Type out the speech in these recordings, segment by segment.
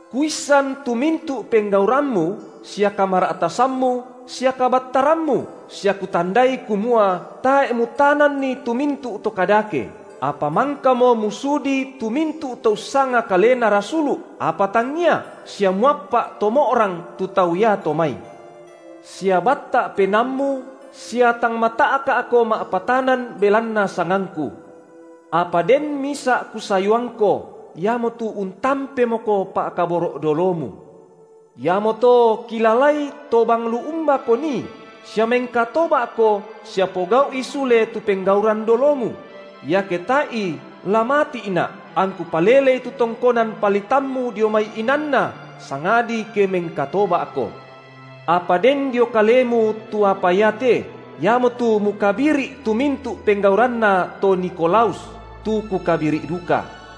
Kuissan tu mintu’ penggaurammu sia kamara’tasammu sia kabattarammu, sia kutandai kumua tae’ mutananni tu mintu’ to kadake, apa mangkamo musudi tu mintu’ to ussanga kalena rasulu’, apa tangngia, sia muappa’ to mo’rang tu tau iato mai; sia batta’ penaammu sia tang mata’ka’ko ma’patanan belanna sangangKu. Apa den misa’ Kusayuangko, iamotu untampemoko pa’kaboro’ dolomu. Iamoto kilalai tobang lu umbako nii, sia mengkatoba’ko sia pogau’i sule tu penggauran dolomu; iake tae’i, la mati’Na’, angKu palelei tu tongkonan palitammu dio mai inanna, sangadi ke mengkatoba’ko. Apa den dio kalemu tu apa iate, iamotu mukabiri’ tu mintu’ penggauranna to Nikolaus, tu Kukabiri’ duka.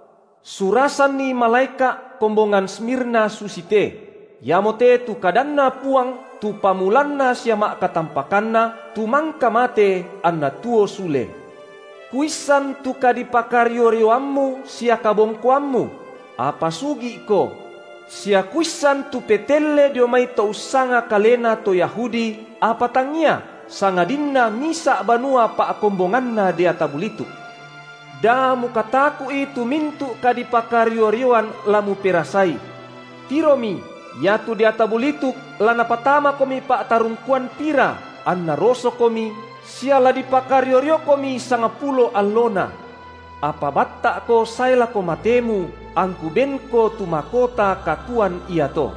Surasanni malaeka’ kombongan Smirna susite: Iamote tu kadanNa Puang tu pamulanna sia ma’katampakanna, tu mangka mate, anna tuo sule: Kuissan tu kadipakario-rioammu sia kabongkoammu – apa sugi’ko – sia Kuissan tu petelle dio mai to ussanga kalena to Yahudi, apa tangngia, sangadinna misa’ banua pa’kombonganna deata bulituk. Da mukataku’i tu mintu’ kadipakario-rioan la muperasai. Tiromi, iatu deata bulituk la napatamakomi pa’tarungkuan pira, anna rosokomi, sia la dipakario-riokomi sangpulo allona. Apa batta’ko sae lako matemu, angKu benko tu makota katuoan iato.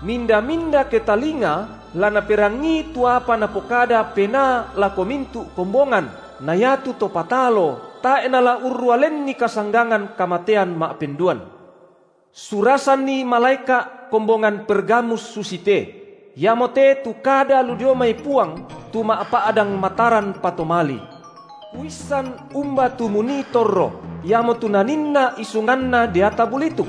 Minda-minda ketalinga la naperangii tu apa Napokada Penaa lako mintu’ kombongan na iatu to patalo tae’ nala urrua lenni kasanggangan kamatean ma’penduan. Surasanni malaeka’ kombongan Pergamus susite: Iamote tu kada lu dio mai Puang tu ma’pa’dang mataran patomali. Kuissan umba tu munii torro, iamotu naninna isunganna deata bulituk.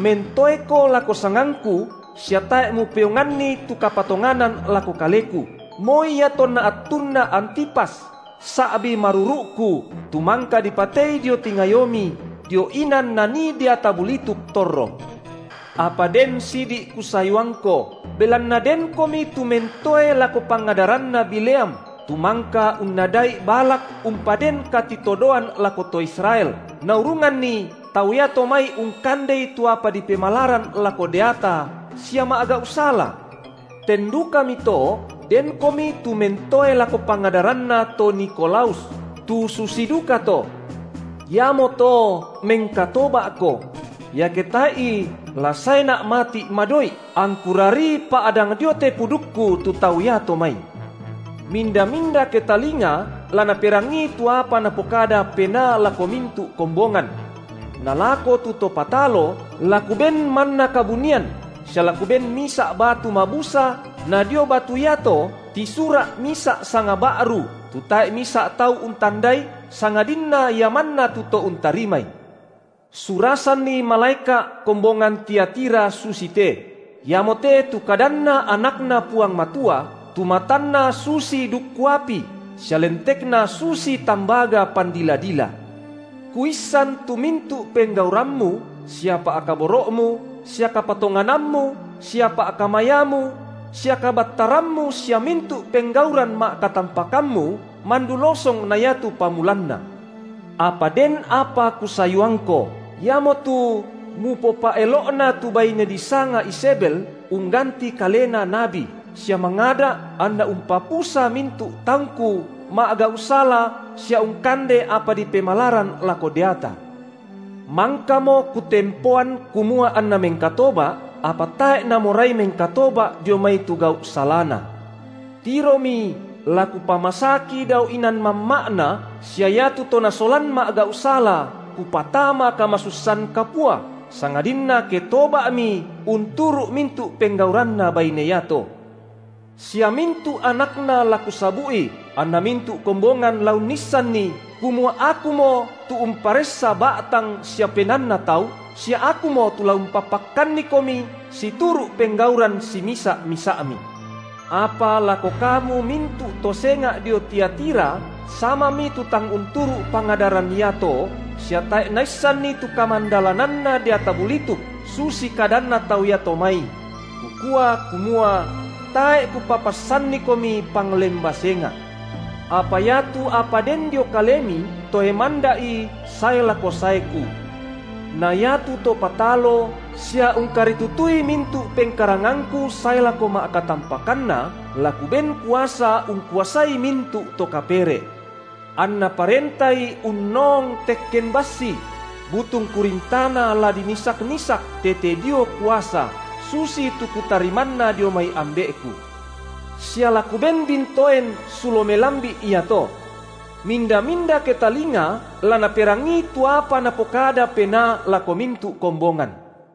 Mentoeko lako sangangKu sia tae’ mupeonganni tu kapatonganan lako Kaleku, moi iatonna attunna Antipas, sa’bi maruru’Ku, tu mangka dipatei dio tingayomi, dio inan nanii deata bulituk torro. Apa den sidi’ Kusayuangko, belanna denkomi tu mentoe lako pangadaranna Bileam, tu mangka unnada’i Balak umpaden katitodoan lako to Israel, naurunganni tau iato mai ungkandei tu apa dipemalaran lako deata, sia ma’gau’ sala. Ten dukami to denkomi tu mentoe lako pangadaranna to Nikolaus, tu susi dukato. Iamoto mengkatoba’ko; iake tae’i la saeNa’ mati’ madoi’, angKu rarii pa’dang dio te pudukKu tu tau iato mai. Minda-minda ketalinga la naperangii tu apa Napokada Penaa lako mintu’ kombongan. Na lako tu to patalo, la Kuben manna kabunian, sia la Kuben misa’ batu mabusa na dio batu iato tisura’ misa’ sanga ba’ru, tu tae’ misa’ tau untandai, sangadinna ia manna tu to untarimai. Surasanni malaeka’ kombongan Tiatira susite: Iamote tu kadanNa AnakNa Puang Matua, tu matanNa susi dukku api, sia lentekNa susi tambaga pandila-dila. Kuissan tu mintu’ penggaurammu, sia pa’kaboro’mu, sia kapatonganammu sia pa’kamayamu sia kabattarammu sia mintu’ penggauran ma’katampakammu mandu losong na iatu pamulanna. Apa den apa Kusayuangko, iamotu mupopa’elo’na tu baine disanga Izebel ungganti kalena nabi, sia mangada’ anna umpapusa mintu’ taungKu ma’gau’ sala sia ungkande apa dipemalaran lako deata. Mangkamo Kutempoan kumua anna mengkatoba’, apa tae’ namorai mengkatoba’ dio mai tu gau’ salana. Tiromi, la Kupamasaki dao inan mamma’na, sia iatu to nasolan ma’gau’ sala Kupatama kamasussan kapua, sangadinna ke toba’mi unturu’ mintu’ penggauranna baine iato. Sia mintu’ anakna la Kusabu’i, anna mintu’ kombongan la unnissanni, kumua Akumo tu umparessa ba’tang sia penaanna tau sia Akumo tu la umpapakkannikomi situru’ penggauran simisa’-misa’mi. Apa lako kamu mintu’ to senga’ dio Tiatira samami tu tang unturu’ pangadaran iato, sia tae’ naissanni tu kamandalananna deata bulituk, susi kadanna tau iato mai, – Kukua, kumua: tae’ Kupapassannikomi panglemba senga’. Apa iatu apa den dio kalemi, toe manda’i sae lako saeKu. Na iatu to patalo, sia ungkaritutui mintu’ pengkarangangKu sae lako ma’katampakanna, la Kuben kuasa ungkuasai mintu’ to kapere’; anna parentai unnoong tekken bassi; butung kurin tana la dinisak-nisak, tete dio kuasa, susitu Kutarimanna dio mai Ambe’Ku sia la Kuben bintoen sulo melambi’ iato. Minda-minda ketalinga la naperangii tu apa Napokada Penaa lako mintu’ kombongan.